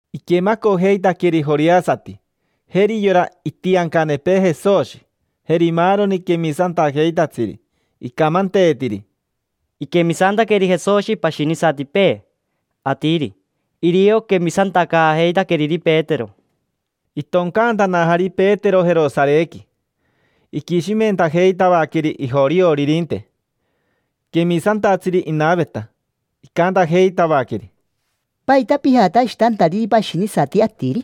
Iquemacojeitaqueri joreasati: jeri yora itiancanepee Jesoshi, jeri maaroni quemisantajeitatsiri. Icamanteetiri: —Iquemisantaqueri Jesoshi pashinisatipee atiri; irio quemisantacaajeitaqueriri Petero. Itoncantanajari Petero Jerosarequi, iquishimentajeitavaqueri ijorioririnte: quemisantatsiri inaveta. Icantajeitavaqueri: —¿Paita pijatashitantariri pashinisati atiri?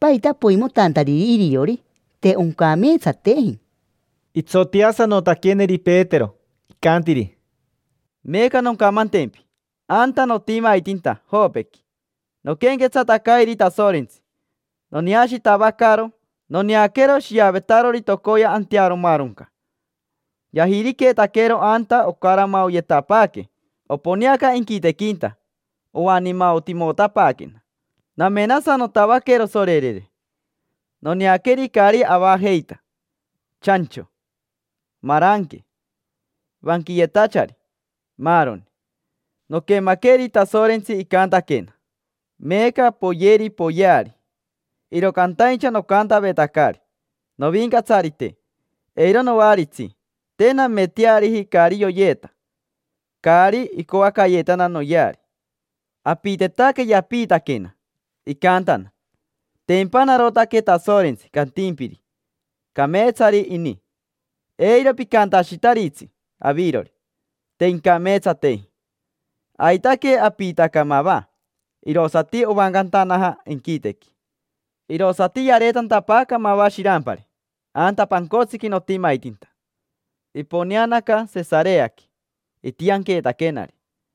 ¿Paita poimotantariri iriori? Te oncameetsateji. Itsoteasanotaqueneri Petero, icantiri: —Meeca noncamantempi. Anta notimaitinta Jopequi, noquenquetsatacairi Tasorentsi. Noneashitavacaro, noneaquero shiavetarori tocoya antearomaronca. Yajiriqueetaquero anta ocaramaoyetapaaque, oponeaca inquitequinta, oaniimaotimotapaaquena. Namenasanotavaquero sorerere: noneaqueri caari avajeita: chancho, maranque, vanquiyetachari, maaroni. Noquemaqueri Tasorentsi, icantaquena: “Meeca poyeri; poyeari”. Iro cantaincha nocantavetacari: “Novincatsarite, eiro noaritsi. Te nameteariji caari yoyeeta, caari icoacayeetana noyeari”. Apitetaque Yapiitaquena, icantana: “Tempa narotaque Tasorentsi cantimpiri: ‘Cameetsari ini’. Eiro picantashitaritsi avirori: ‘Te incameetsateji’”. Aitaque apiitaca mava. Irosati ovancantanaja inquitequi. Irosati yareetantapaaca mava shirampari anta pancotsiqui notimaitinta. Iponeanaca Sesareaqui, itianqueetaquenari.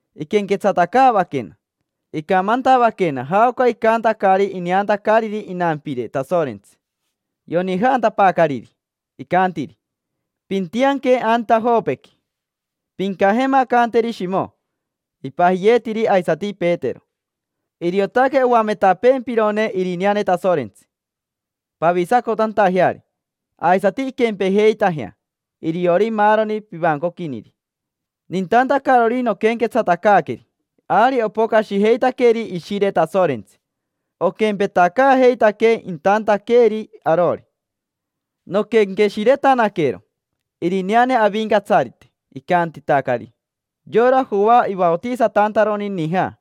Iquenquetsatacaavaquena, icamantavaquena jaoca icantacari ineantacariri inampire Tasorentsi. Yonijantapaacariri, icantiri: “Pintianque anta Jopequi. Pincajemacanteri Shimo: ipajiyeetiri aisati Petero. Iriotaque oametapeempirone irineane Tasorentsi, pavisacotantajeari. Aisati inquempejeitajea iriori maaroni pivancoquiniri”. Nintantacarori noquenquetsatacaaqueri, ari opocashijeitaqueri Ishire Tasorentsi. Oquempetacaajeitaquee intantaqueeri arori. Noquenqueshiretanaquero irineane Avincatsarite icantitacari: “Yora Joa ivaotisatantaroni nija,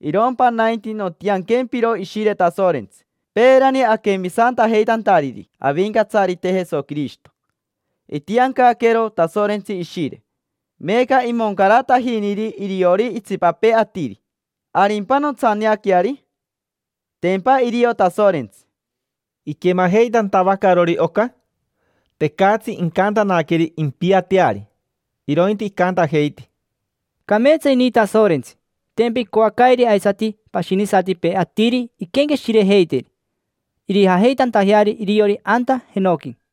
irompa nainti nontianquempiro Ishire Tasorentsi”. Peerani aquemisantajeitantariri Avincatsarite Jesoquirishito, itiancaqueero Tasorentsi Ishire. Meeca imoncaratajiniri iriori itsipapee atiri. ¿Arimpa nontsaneaqueari? Tempa irio Tasorentsi. Iquemajeitantavacarori oca, tecatsi incantanaqueri impiateari, irointi icantajeiti: —Cameetsa ini Tasorentsi. Tempa icoacairi aisati pashinisatipee atiri iquenqueshirejeitiri, irijajeitantajeari iriori anta jenoqui.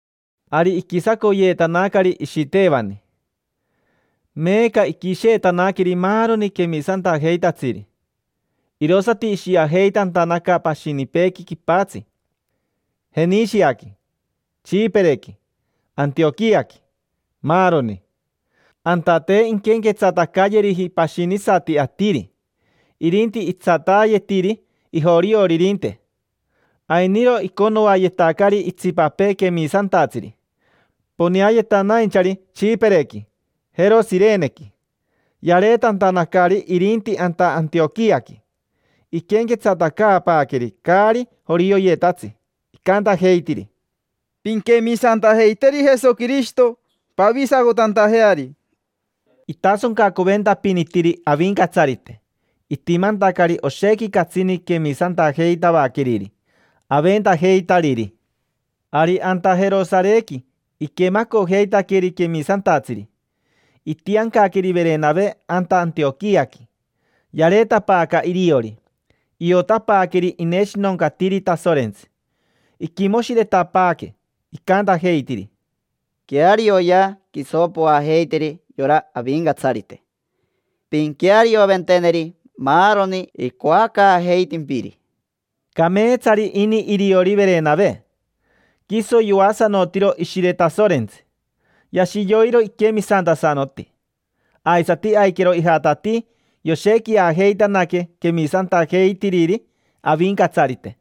Ari iquisacoyeetanacari Ishitevani. Meeca iquisheetanaqueri maaroni quemisantajeitatsiri, irosati ishiajeitantanaca pashinipeequi quipatsi: Jenishiaqui, Tsipirequi, Antioquiaqui, maaroni. Anta te inquenquetsatacayeriji pashinisati atiri, irinti itsataayetiri ijorioririnte. Ainiro iconoayetacari itsipapee quemisantatsiri, poneayetanainchari Tsipirequi, jero Shirenequi. Yareetantanacari irinti anta Antioquiaqui, iquenquetsatacaapaaqueri caari jorioyetatsi. Icantajeitiri: —Pinquemisantajeiteri Jesoquirishito pavisacotantajeari. Itasoncacoventapinitiri Avincatsarite, itimantacari oshequi catsini quemisantajeitavaqueriri, aventajeitariri. Ari anta Jerosarequi iquemacojeitaqueri quemisantatsiri. Itiancaqueri Verenave anta Antioquiaqui. Yareetapaaca iriori, iotapaaqueri ineshinoncatiri Tasorentsi. Iquimoshiretapaaque, icantajeitiri: —Quearioyea, quiso poajeiteri yora Avincatsarite, pinquearioventeneri maaroni icoacaajeitimpiri. Cameetsari ini iriori Verenave. Quiso yoasanotiro Ishire Tasorentsi, yashi yoiro iquemisantasanoti. Aisati aiquero ijatatii yoshequiajeitanaque quemisantajeitiriri Avincatsarite.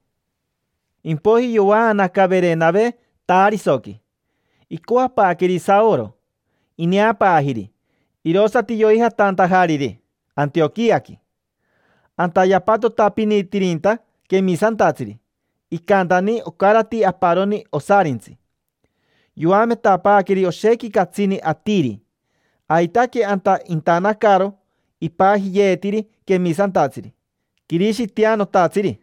Impoiji yovaanaca Verenave Tarisoqui, icoapaaqueri Saoro. Ineapaajiri, irosati yoijatantajariri Antioquiaqui. Anta yapatotapinitirinta quemisantatsiri. Icantani, ocarati aparoni osarintsi. Yoametapaaqueri oshequi catsini atiri. Aitaque anta intanacaro ipajiyeetiri quemisantatsiri: “Quirishitianotatsiri”.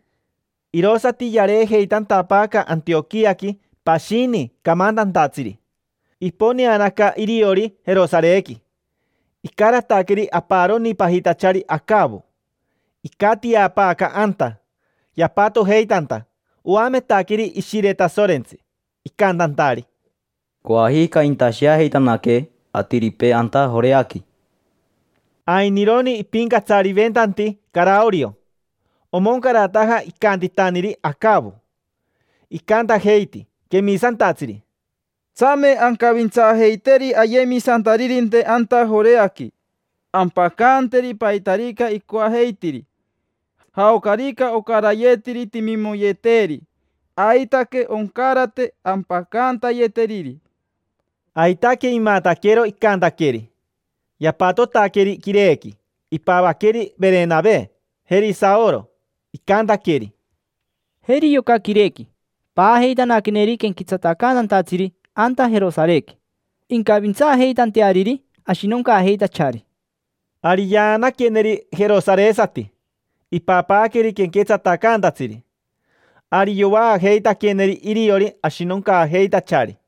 Irosati yareejeitantapaaca Antioquiaqui pashini camantantatsiri, iponeanaca iriori Jerosarequi. Icarataqueri aparoni, pajitachari Acavo. Icatiapaaca anta yapatojeitanta, oametaqueri Ishire Tasorentsi, icantantari: —Coajica intasheajeitanaque atiripee anta Joreaqui. Ainironi ipincatsariventanti Caraorio, omoncarataja icantitaniri Acavo. Icantajeiti quemisantatsiri: —Tsame ancavintsaajeiteri ayemisantaririnte anta Joreaqui, ampacanteri paitarica icoajeitiri. Jaocarica ocarayetiri timimoyeteeri, aitaque oncarate ampacantayeteriri. Aitaque imataquero icantaqueri. Yapatotaqueri quirequi, ipavaqueri Verenave, jeri Saoro. Icantaqueri: —Jeri yoca quirequi: paajeitanaqueneri quenquetsatacantatsiri anta Jerosarequi, incavintsaajeitanteariri ashinoncaajeitachari. Ari yaanaqueneri jerosaresati, ipapaaqueri quenquetsatacantatsiri. Ari yovaajeitaqueneri iriori ashinoncaajeitachari.